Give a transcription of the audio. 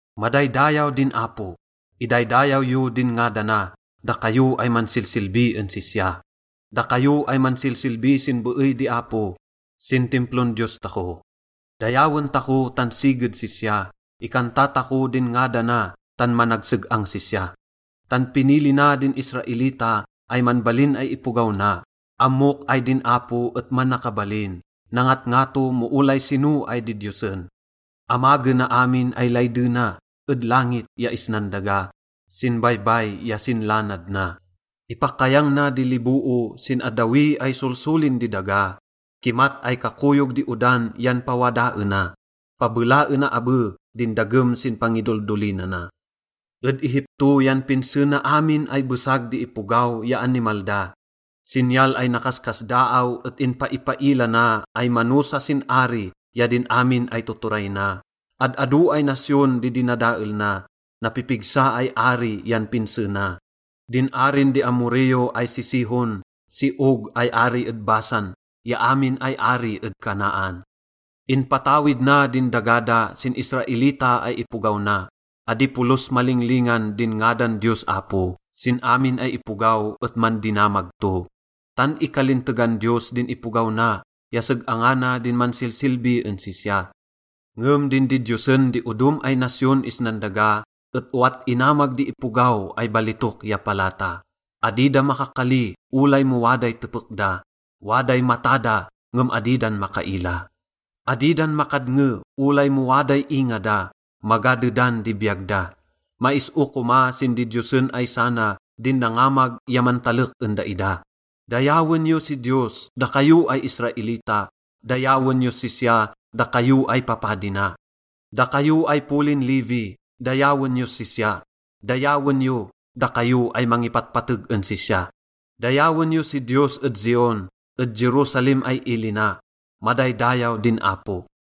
Madaydayaw din Apo! Idaydayaw yo din ngadana, dakayo ay mansilsilbi en sisya, dakayo ay mansilsilbi sin beey di Apo, sin Timplon Diyos tako. Dayawen tako tan siged sisya, ikanta tako din ngadana tan managseg-ang sisya. Tan pinili na din Israelita ay manbalin ay ipogaw na. Ammok ay din Apo et manakabalin, nangatngato mo olay sino ay didiyosen. Amagena amin ay laydena ed langit ya isnan daga, sin baybay ya sin lanad na. Ipakayang na di liboo sin addawi ay solsolin di daga, kimat ay kakoyog di odan yan pawadaena, pabelaena abe din dagem sin pangidoldolinana. Ed Egipto yan pinse na amin ay besag di ipogaw ya animal da. Sinyal ay nakaskasdaaw et inpaipaila na ay manosa sin ari ya din amin ay tuturay na. Ad-ado ay nasyon di dinadael na, napipigsa ay ari yan pinse na: din arin di Amorreo ay si Sihon, si Og ay ari ed Basan ya amin ay ari ed Canaan. Inpatawid na din daga da sin Israelita ay ipogaw na. Adi polos malinglingan din ngadan Diyos Apo, sin amin ay ipogaw et mandinamag to. Tan ikalintegan Diyos din ipogaw na ya seg-angana din mansilsilbi en sisya. Ngem din didiyosen di odom ay nasyon isnan daga et owat inamag di ipogaw ay balitok ya palata. Adi da makakali olay mo waday tepek da, waday mata da ngem adi dan makaila. Adi dan makadnge olay mo waday inga da, maga dedan di biyag da. Mais-o koma sin didiyosen ay sana din nangamag ya mantalek en daida. Dayawen yo si Diyos, dakayo ay Israelita, dayawen yos sisya, dakayo ay papadi na. Dakayo ay polin Levi, dayawen yos sisya, dayawen yo, dakayo ay mangipatpateg en sisya. Dayawen yo si Diyos ed Zion, ed Jerusalem ay ili na. Madaydayaw din Apo!